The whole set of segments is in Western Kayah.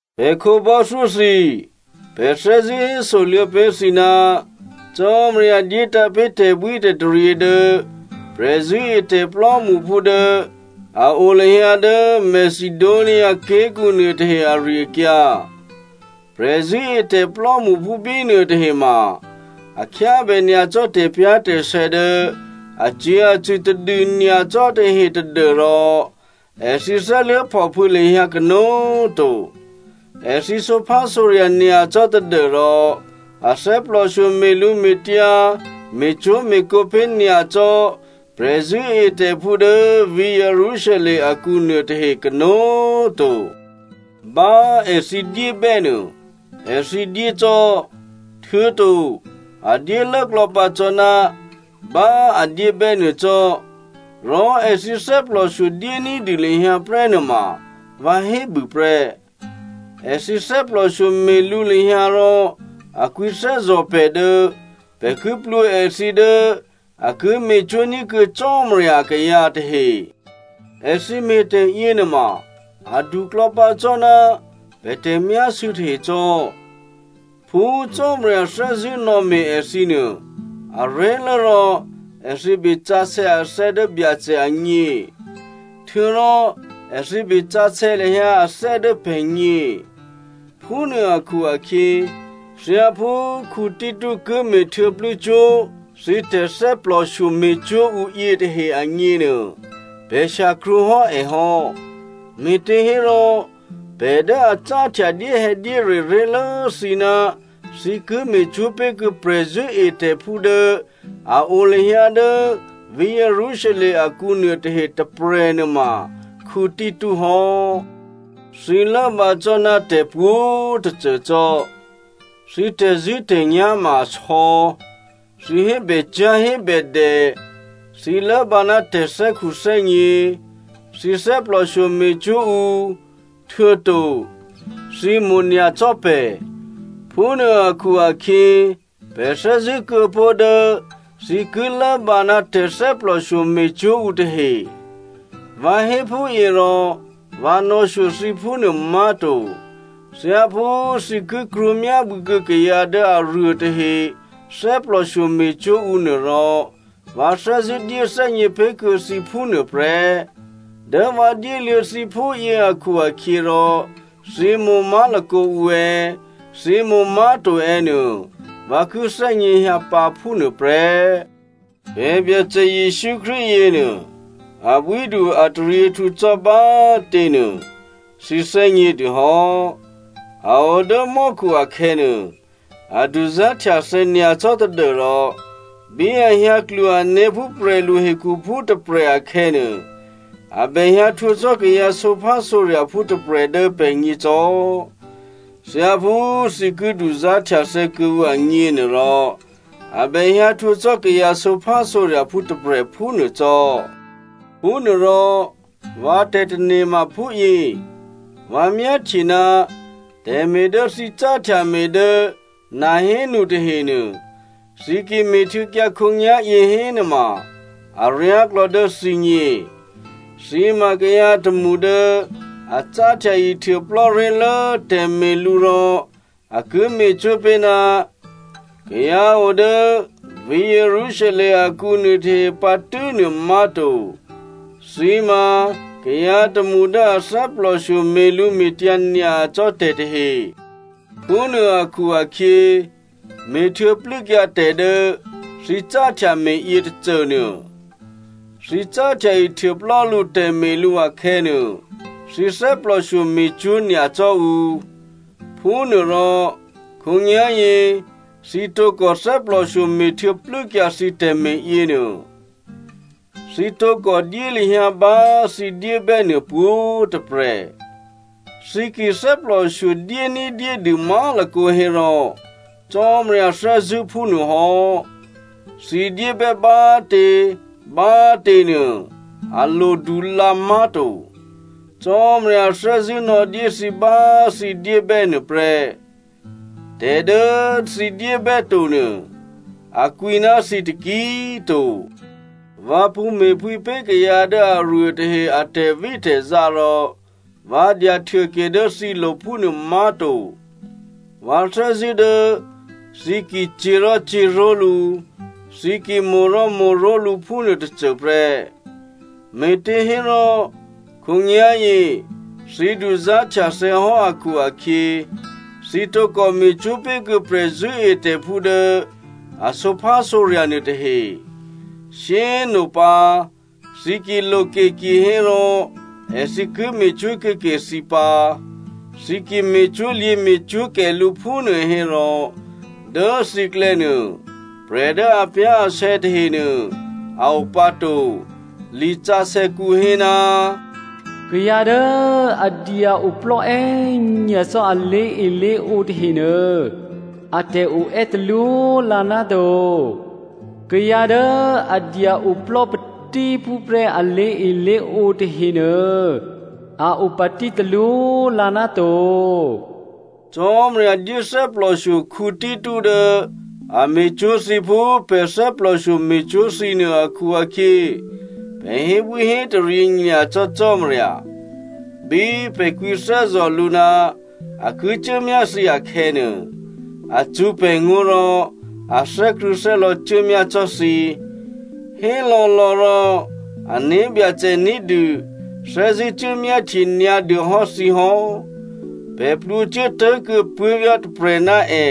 Pè̤ khǒbò́thyó thǐ꤮, pè̤ thè́zṳ̂́ hésoluô̌ pé̤ thǐ ná Cò́marya dyétǎ̤ pé̤ tè̤bwítè̤taryě dố prè̤zṳ̂́etè̤ plò́mṳphú dố a o lahyǎ dố Macedonia ké̤kǔ nuôtahe ari-akyǎ. Prè̤zṳ̂́etè̤ plò́mṳphú bínuôtahe ma, a khyábè nyacò́ tè̤pyá̤tè̤sè̌ dố acyě̤acṳ̂ tadû nyacò́ tahe tadû́rò èthǐ thè́luố̤phòphû̌ lahyǎ kanó̤꤮ to. Èthǐ sǒphásǒrya̤ nyacò́ tadû́rò a thè́plòshyo me̤lǔme̤tyǎ me̤cwó̤me̤kǒ pé̤ nyacò́ prè̤zṳ̂́etè̤phú dố vǐ̤ Jerusalem akǔ nuôtahe kanó̤꤮ to. Bá èthǐ dyébè́nuô èthǐ dyé cò́, htuô̌to a dyélốklò̌ pǎ cò́ ná bá a dyébè́nuô cò́, rò èthǐ thè́plòshyo dyé ní̤dû lahyǎ prè́ nuôma vǎ hébû prè́. Èthǐ thè́plòshyo me̤lǔ lahyǎ rò a kwǐthè́zò̤ pè̤ dố pè̤ ki plwǒ èthǐ dố a ki me̤cwó̤ ní̤kuô̌ Cò́marya akayǎ tahe. Èthǐ me̤tè̤ yěnuôma, aduklò̌ pǎ cò́ ná pè̤ tè̤myásû̌ tahe cò́. Phú Cò́marya thè́zṳ̂́ nò̌me̤ èthǐ nuô, aré̤lố rò èthǐ besǎsè̌ athè́ dố Byacè agně, htuô̌rò èthǐ besǎsè̌ lahyǎ athè́ dố pè̤gně. Phúnuô akhu-akhyě, thyáphú Tito ki me̤htuô̌plû́ cwó̤ thǐ tè̤thè́plòshyo me̤cwó̤ ǔ yětahe agněnuô pè̤ shyakrwǒ hò́ è hò́. Me̤těhérò prè̤ dố a cáhtya dyéhè̌dyére ré̤lố thǐ ná thǐ ki me̤cwó̤ pé̤ kuô̌ prè̤zṳ̂́etè̤phú dố a o lahyǎ dố vǐ̤ Jerusalem akǔ nuôtahe tôprè̤ nuôma Tito hò́. Thǐ lốbǎ cò́ ná tè̤pwǒ̤꤮ tôcô cò́. Thǐ tè̤zṳ̂́tè̤nyá̤ ma asò̌, thǐ hébècyá̤ hébèdè, thǐ lốbǎ ná tè̤thè́khuthè́gně, thǐ thè́plòshyo me̤cwó̤ ǔ, htuô̌to thǐ mo̤nyacò́ pè̤. Phúnuô akhu-akhyě, pè̤ thè́zṳ̂́ kuô̌ pó̤ dố thǐ ki lốbǎ ná tè̤thè́plòshyo me̤cwó̤ ǔ tahe. Vǎ hé phúyě rò vǎ nò̌shyo thǐ phúnuô má̤to. Thyáphú thǐ ki krwǒmyábû̌ kuô̌ kayǎ dố aruôtahe thè́plòshyo me̤cwó̤ ǔ nuôrò, vǎ thè́zṳ̂́ dyéthè́gně pé̤ kuô̌ thǐ phúnuô prè́. Dố vǎ dyéluô̌ thǐ phúyě akhu-akhyěrò thǐ mo̤ má̤lakǒ ǔ è̌, thǐ mo̤ má̤to è̌ nuô, vǎ ki thè́gněhyǎ pǎ phúnuô prè́. Pè̤ Byacè Jesǔ Krístu yěnuô abwídu ataryěhtǔ cò́ bá꤮ těnuô, thǐ thè́gnědû hò́. A o dố mò́khu akhè̌nuô, a duzá̤htyathè̌ nyacò́ tadû́rò bí a hyǎ klwo ané̤ phú prè̤lu hekhuphú tôprè̤ akhè̌nuô, a bèhyǎ htwǒ cò́ kayǎ sǒphásǒrya̤phú tôprè̤ dố pè̤gně cò́. Thyáphú thǐ ki duzá̤htyathè̌ kuô̌ǔ agněnuôrò, a bèhyǎ htwǒ cò́ kayǎ sǒphásǒrya̤phú tôprè̤ phúnuô cò́. Phúnuôrò vǎ tè̤tane̤ ma phúyě, vǎ myáhtye ná tè̤me̤ dố thǐ cáhtya me̤ dố nahénu tahenuô, thǐ ki me̤htuô̌kyǎ khǒnyá̤yě hénuôma aryáklò̌ dố thǐgně. Thǐ ma kayǎ tômṳ dố a cáhtya ihtuôplò́ ré̤lố tè̤me̤lǔ rò a ki me̤cwó̤ pé̤ ná kayǎ o dố vǐ̤ Jerusalem akǔ nuôtahe pǎ tû́nuô má̤to, thǐ ma kayǎ tômṳ dố a thè́plòshyo me̤lǔme̤tyǎ nyacò́ tè̤ tahe. Phúnuô akhu-akhyě, me̤htuô̌ plû́kyǎ tè̤ dố thǐ cáhtya me̤ yě tôcônuô. Thǐ cáhtya ihtuôplò́ lú tè̤me̤lǔ akhè̌nuô, thǐ thè́plòshyo me̤cwó̤ nyacò́ ǔ. Phúnuôrò khǒnyá̤yě thǐ tǒkò thè́plòshyo me̤htuô̌ plû́kyǎ thǐ tè̤me̤ yěnuô. Thǐ tǒkò dyé lahyǎ bá thǐ dyébè́ nuô pwǒ̤꤮ tôprè̤. Thǐ ki thè́plòshyo dyé ní̤dyédû má̤lakǒ hérò Cò́marya thè́zṳ̂́ phúnuô hò́. Thǐ dyébè́ bá꤮ tě bá꤮ tě nuô, a lodu lǎ má̤to. Cò́marya thè́zṳ̂́ nò̌dyé thǐ bá thǐ dyébè́ nuôprè́. Tè̤ dố thǐ dyébè́to nuô a kwǐ ná thǐ taki꤮ to. Vǎ pṳ̌ me̤phwǐ pé̤ kayǎ dố aruô tahe a tè̤vítè̤zá rò vǎ dyahtyahtuôke dố thǐlo̤ phúnuô má̤to. Vǎ thè́zṳ̂́ dố thǐ ki cyě̤ rò cyě̤ró̤lǔ, thǐ ki mo̤ rò mo̤ró̤lǔ phúnuô tôcôprè́. Me̤těhérò, khǒnyá̤yě thǐ duzá̤htyathè̌ hò́ akhu-akhyě, thǐ tǒkò me̤cwó̤ pé̤kuô̌ prè̤zṳ̂́etè̤phú dố a sǒphásǒrya̤ nuôtahe. Shyé꤮ nopǎ thǐ ki loke kihérò èthǐ ki me̤cwó̤ kuô̌ke thǐ pǎ. Thǐ ki me̤cwó̤lyě̤ me̤cwó̤kè lǔ phúnuô hérò, dố thǐklè̌ nuô prè̤ dố apyá̤asè̌ tahenuô a o pǎ to. Lisǎsè̌kǔ hé, “Kayǎ dố a dya-oplò́ è́nyacò́ a lé̤elé̤ǒ tahenuô atè̤ oè́ talwó lǎ náto. Kayǎ dố a dya oplò́ patíphúprè́ a lé̤elé̤ǒ tahenuô, a o patí talwó lǎ ná to.” Cò́marya dyé thè́plòshyo Tito dố a me̤cwó̤ thǐ phú pè̤ thè́plòshyo me̤cwó̤ thǐ nuô akhu-akhyě, pè̤ hébwíhétaryě nyacò́ Cò́marya. Bí pè̤ kwǐthè́zò̤ lǔ ná a ki cuốmyá thǐ akhè̌nuô, a cṳ̌ pè̤ngó̤ rò a thè́krṳ̂̌thè́lò̌ cuốmyá cò́ thǐ. Hélò̌lò̌ rò ané̤byacè ní̤dû thè́zṳ̂́ cuốmyáhtye nyǎdû hò́ thǐ hò́. Pè̤ plwǒcuố tố̤kuô̌ puố̤vyá̤ tôprè̤ ná è.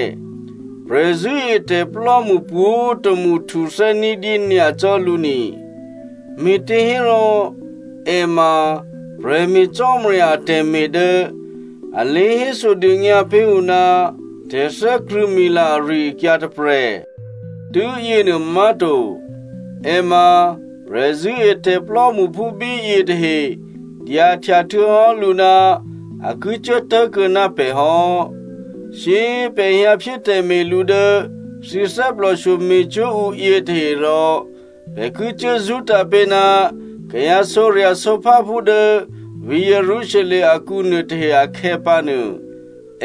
Prè̤zṳ̂́etè̤plò́mṳ pwǒ̤tômṳ htuthè́ ní̤dyé nyacò́ lǔ ni, me̤těhérò è ma prè̤me̤ Cò́marya atè̤me̤ dố a lě hésodônyǎ pé̤ ǔ ná tè̤thè́krṳ̂̌mila ari-akyǎ tôprè̤. Tû́yěnuô má̤to, è ma prè̤zṳ̂́etè̤ plò́mṳphú bíyě tahe dyahtya htuô̌hò́ lǔ ná a ki cuố tố̤kuô̌ ná pè̤ hò́. Shyé꤮ pè̤ hyǎphyé tè̤me̤lǔ dố thǐ thè́plòshyo me̤cwó̤ ǔ yětahe rò pè̤ ki cuố zṳ́tǎ̤ pé̤ ná kayǎ sǒrya̤sǒpháphú dố vǐ̤ Jerusalem akǔ nuôtahe akhè̌pǎnuô,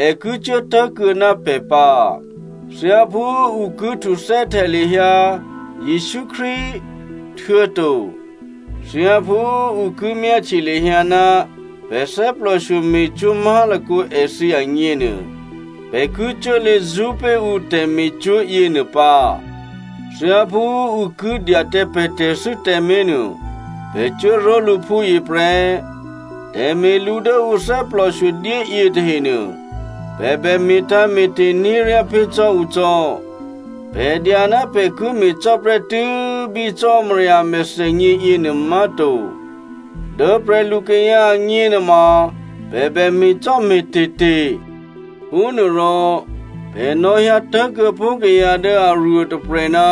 è ki cuố tố̤kuô̌ ná pè̤ pǎ. Thyáphú ǔ ki htuthè́htya lahyǎ Jesǔ Krístu, htuô̌to thyáphú ǔ ki myáhtye lahyǎ ná pè̤ thè́plòshyo me̤cwó̤ má̤lakǒ èthǐ agněnuô, pè̤ ki cuốlě zṳ́pé̤ ǔ tè̤me̤cwó̤ yěnuô pǎ. Thyáphú ǔ ki dya tǎ pè̤ tè̤thû́ tǎmé̤ nuô, pè̤ cuốró̤lǔ phúyě prè́. Tè̤me̤lǔ dố ǔ thè́plòshyo dyé yětahenuô, pè̤ bè me̤tǎ̤me̤te̤ ní̤ ryá pé̤ cò́ ǔ cò́. Pè̤ dya ná pè̤ ki me̤cò́ prè́tû́ bí Cò́marya a mèthènyě yěnuô má̤to, dố prè̤lukayǎ agně nuôma pè̤ bè me̤cò́me̤te̤te̤. Phúnuôrò pè̤ nò̌hyǎ tố̤kuô̌ pó̤ kayǎ dố aruôtôprè̤ ná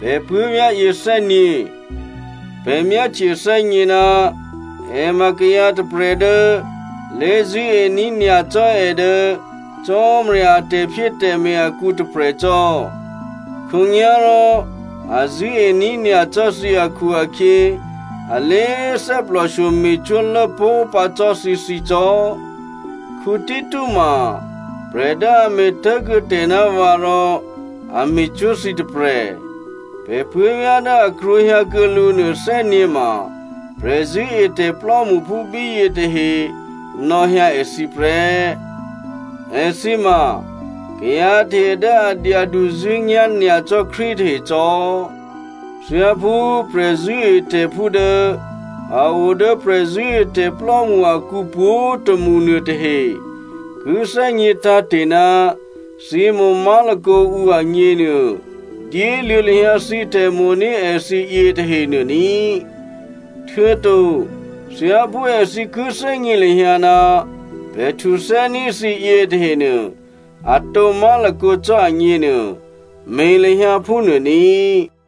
pè̤ puố̤vyá̤ yě thè́gně. Pè̤ myáhtye thè́gně ná è ma kayǎ tôprè̤ dố lé̤zṳ̂́ení̤ nyacò́ è dố Cò́marya a tè̤phyétè̤me̤ akǔ tôprè̤ cò́. Khǒnyá̤rò a zṳ̂́ení̤ nyacò́ thǐ akhu-akhyě a lé꤮ thè́plòshyo me̤cwó̤ lốpó̤ pǎ cò́ thǐthǐ cò́. Tito ma prè̤ dố a me̤ tố̤kuô̌ tè̤ ná vǎ rò a me̤cwó̤ thǐ tôprè̤. Pè̤ puố̤vyá̤ dố a krwǒhyǎkuô̌ lǔ nuô thè́gně ma, prè̤zṳ̂́etè̤ plò́mṳphú bíyě tahe nò̌hyǎ èthǐ prè́. Èthǐ ma kayǎ tahe dố a dyaduzṳ̂́nyá̤ nyacò́ Krístu tahe cò́. Thyáphú prè̤zṳ̂́etè̤phú dố a o dố prè̤zṳ̂́etè̤plò́mṳ akǔ pwǒ̤tômṳ nuôtahe ki thè́gně tǎ̤te̤ ná thǐ mo̤ má̤lakǒ ǔ agněnuô, dyéluô̌ lahyǎ thǐ tè̤mo̤ní̤ èthǐ yětahenuô ní꤮. Htuô̌to thyáphú èthǐ ki thè́gně lahyǎ ná pè̤ htuthè́ní̤ thǐ yětahenuô atǒ má̤lakǒ cò́ agněnuô, me̤ lahyǎ phúnuô ní꤮.